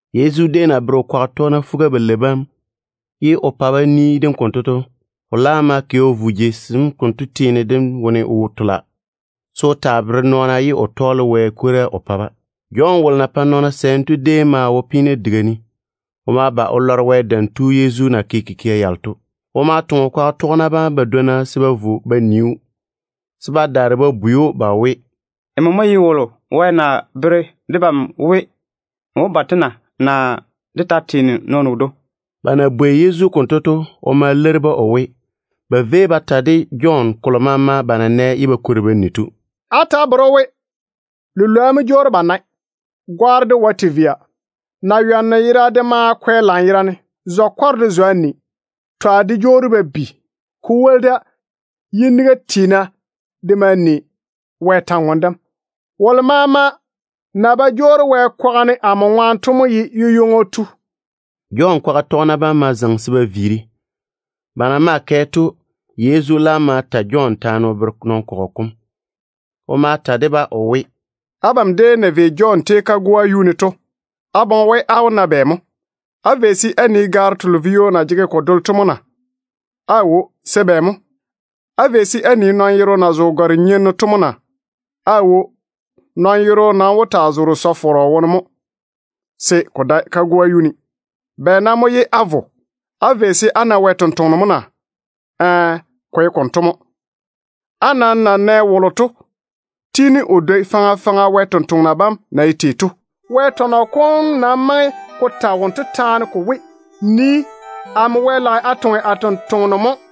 Yezu déem na pɛ o kwaga tɔgena fuga-balei bam o ni dem o ti to, o laam ma kɛ o vo jei sem konto teene dem wone o tola, se o taa bere nɔɔna ye o tɔɔle Wɛ kwora o pa-ba. Jɔn wolo na pae nɔɔna sɛɛm Wɛ ŋwaane to déem maa wo peena diga ne. O ma ba o lɔre Wɛ Dam Tu Yezu na ke kikia yalo to. O ma toŋe o kwaga tɔgena badwonna se ba vo ba nii‑o, se ba daare ba bwei‑o we, “Nmo mo ye wolo Wɛ na bere debam we o wó ba to na? Naa dé ta wó taa teene nɔɔno wodwoŋi mo?” Ba na bwei Yezu konto to, o ma leiri-ba o we, ba véi ba ta de Jɔn kolo maama ba na nɛ ye ba kwori ba ni to. “Á ta á bere‑o we, lilwoa jwoori ba nae, gwaaro de wae te via, naywanno yera de maa kwɛ lanyerane, zwa-kwarro de zwa ni, twa de jwoori ba bi. Ko woli da, yiniga tiina de maa ni Wɛ kwor-ywoŋa kam. Wolo maama na ba jwoori Wɛ kwaga ne amo ŋwaane to mo ye yu-ywoŋo tu.” Jɔn kwaga tɔgena bam ma zaŋe se ba viiri. Ba na maa kɛ to, Yezu laam ma ta Jɔn taane o bere nɔn-kɔgɔ kom. O ma ta de-ba o we: “Abam déem na vei Jɔn tei kagoa yuu ne to, á boŋe we á wó na bɛ mo? Á vei se á nii gaaro telo vio na jege ko dole to mo na? Aawo. Se bɛ mo? Á vei se á nii nɔn-yero na zo gare-nyenno to mo na? Aawo. Nɔn-yero nam wó taa zoore sɔ-fɔrɔ wone mo, se ko dae kagoa yuu ne. Bɛ nam mo ye á vo? Á vei se á na Wɛ sampwora mo na? Ɛɛ, ko ye konto mo. Á nam na nɛ wolo to tiini o dwoi faŋa faŋa Wɛ sampwori sem na ye tei to. Wɛ tɔnɔ kom nam maŋe ko ta wonto taane ko we, ‘Nii, amo Wɛ lage a toŋe a tontoŋeno mo,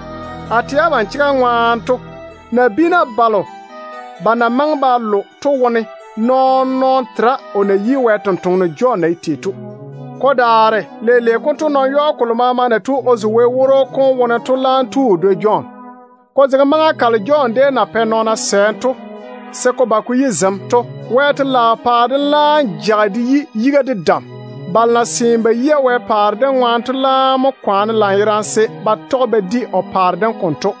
A tɛ abam chega ŋwaane to, nabiina balo ba na maŋe ba lo to wone nɔɔn-nɔɔno tera o na yi Wɛ tontoŋeno Jɔn na ye tei to. Ko daare leile konto, nɔn-yɔɔ kolo maama na zo Wɛ woro kom wone to laam tu o dwoi Jɔn. Ko zege maŋa kalo Jɔn déem na pɛ nɔɔna sɛɛm to, se ko ba ko yi zem to, Wɛ telaao paare dem laam jage de yi yiga de dam. Balo na seene ba yia Wɛ paare dem ŋwaane to laam mo kwaane lanyerane se ba tɔge ba di o paare dem konto.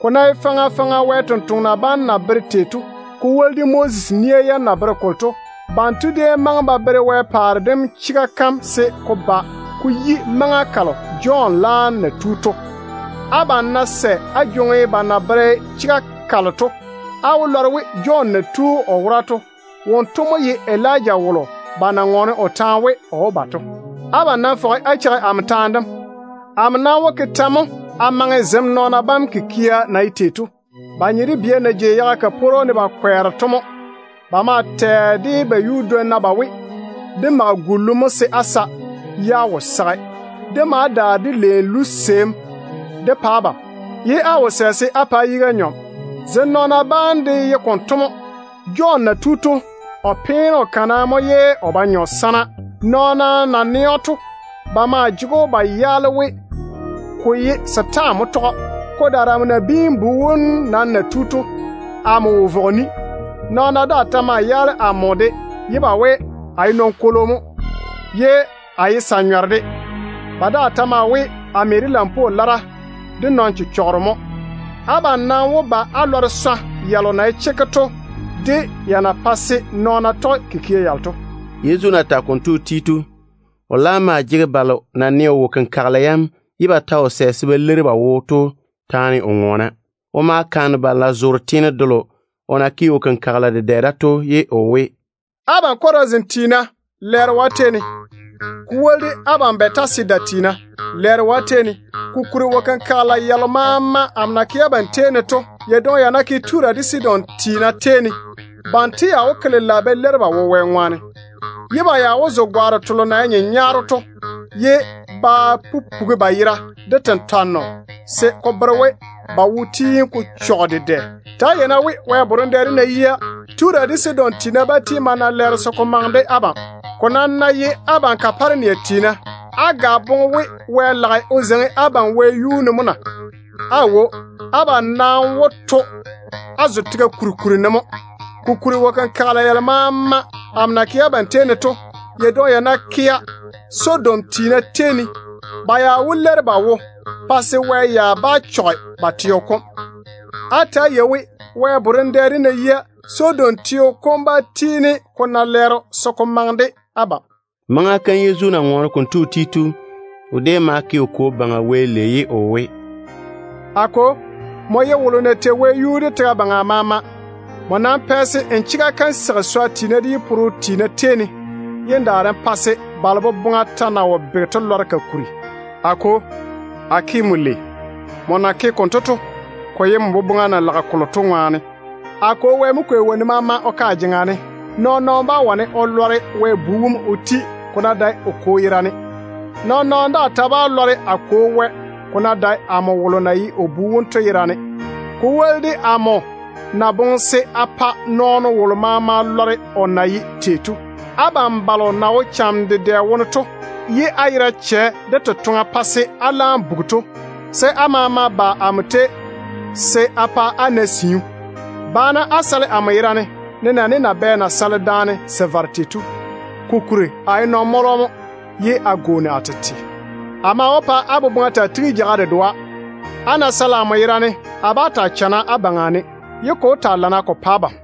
Ko ná ye faŋa faŋa Wɛ sampwori sem de Moses de déem na bere kolo to, ba maŋe ba bere Wɛ paare dem chega kam se ko ba ko yi maŋa kalo Jɔn laam na tu to. Abam ná sɛ á jwoŋi ba na bere chega kalo to, á wó lɔre we Jɔn na tu o wora to, wonto mo ye Elija wolo ba déem na ŋɔɔne o taane we o wó ba to. Abam nam fɔge á cheigi amo taane dem. Amo nam wó ke tɛ mo a maŋe zem nɔɔna bam kikia na ye tei to? Ba nye de bia na jei yaga kaporo ne ba kwɛɛra to mo. Ba maa tɛ de ba yuudwonna ba we: ‘Dé mage gullu mo se á sa, ye á wo sage. Dé ma daare dé leeni luseim dé pa abam, ye á wo sɛ se á pa á yiga nyɔne.’ Zem nɔɔna bam de ye konto mo. Jɔn na tu to, o peene o kana mo ye o ba nyɔ sana. Nɔɔna na nɛ‑o to, ba maa jege‑o ba yaala we, ko ye setaane mo tɔge‑o. Ko daare amo Nabiin-bu wom nam na tu to, amo wo vɔge ni. Nɔɔna daa ta ma yaale amo de ye ba we, a ye nɔn-kwolo mo, ye a ye sa-nyɔro de. Ba daa ta maa we, a me de lampwoo lara de nɔn-chechɔgero mo. Abam nam wó ba á lɔre swa yalo na ye chekke to de ya na pae se nɔɔna tɔge kikia yalo to.” Yezu na tage konto o ti to, o laam maa jege balo na nɛ o wo-kenkagela yam ye ba ta wo sɛ se ba leiri ba wo to taane o ŋɔɔna. O ma kaane balo na zoore teene delo o na ke wo-kenkagela dedɛ da to, ye o we, “Abam Chorazin tiina, lɛɛro yi abam! Ko woli de abam Bɛtasida tiina, lɛɛro yi abam! Kokuri, wo-kenkagela yalo maama amo na ke abam tei ne to, ya dwoŋi ya ná kea Tura de Sidon tiina tei ne, banto ya wó ke lela ba leiri ba wo Wɛ ŋwaane. Ba maa wó zo gare-nyenyaaro ye ba jei tentwarem wone ba wo-chechɔgɔ kom ŋwaane. Ta‑á yei-na we, Wɛ borem dɛ dem ná yia, Tura de Sidon tiina bá tiini ba na lɛɛro se ko maŋe de abam. Ko nam ná ye abam Kaparenia tiina, á ga boŋe we Wɛ lage o zeiŋi abam wɛyuu ne mo na? Aawo. Abam nam wó to á zo tega kuri kuri ne mo. Kokuri, wo-kenkagela yalo maama amo na ke abam tei ne to, ya dwoŋi ya ná kea Sodom tiina tei ne, ba ya wó leiri ba wo pa se Wɛ ya bá chɔge ba teo kom. Á ta‑á yei we, Wɛ borem dɛ dem ná yia, Sodom teo kom bá tiini ko na lɛɛro se ko maŋe de abam.” Maŋa kam Yezu na ŋɔɔne konto o ti to, o déem ma ke o Kwo Baŋa Wɛ lei ye o we, “A Kwo, nmo mo ye wolo na tei wɛyuu de tega baŋa maama. Nmo nam pɛ se n chega kam seigi swa tiina de yi-pore-nyena tei ne, ye n daare n pa se balo boboŋa ta na wo bege to lɔre ka kuri. A Kwo, a ke nmo lei. Nmo na ke konto to, ko ye n boboŋa na lage kolo to ŋwaane. A Kwo Wɛ mo kwei wonnu maama o ke a jeŋa ne. Nɔɔn-nɔɔno bá wane o lɔre Wɛ Bu wom o ti, ko ná dae o Kwo yerane. Nɔɔn-nɔɔno daa ta bá lɔre a Kwo Wɛ, ko ná dae amo wolo na ye o Bu wom to yerane, ko woli de amo na boŋe se a pa nɔɔno wolo maama lɔre o na ye tei to. Abam balo na wo cham dedɛ wone, ye á yera chɛ de totoŋa pa se á laam bugi to, se á maama ba amo tei se a pa á na siu. Ba-na á sale amo yera ne, nenɛɛne nabɛ na sale daane se vare tei to. Kokuri a ye nɔn-mɔlɔ mo ye a gwooni a tete. A maa wó pa á boboŋa taa tigi jeiga dedoa. Á ná sale amo yera ne, a bá taa chana á baŋa ne, ye ko wó taa lana ko pa abam.”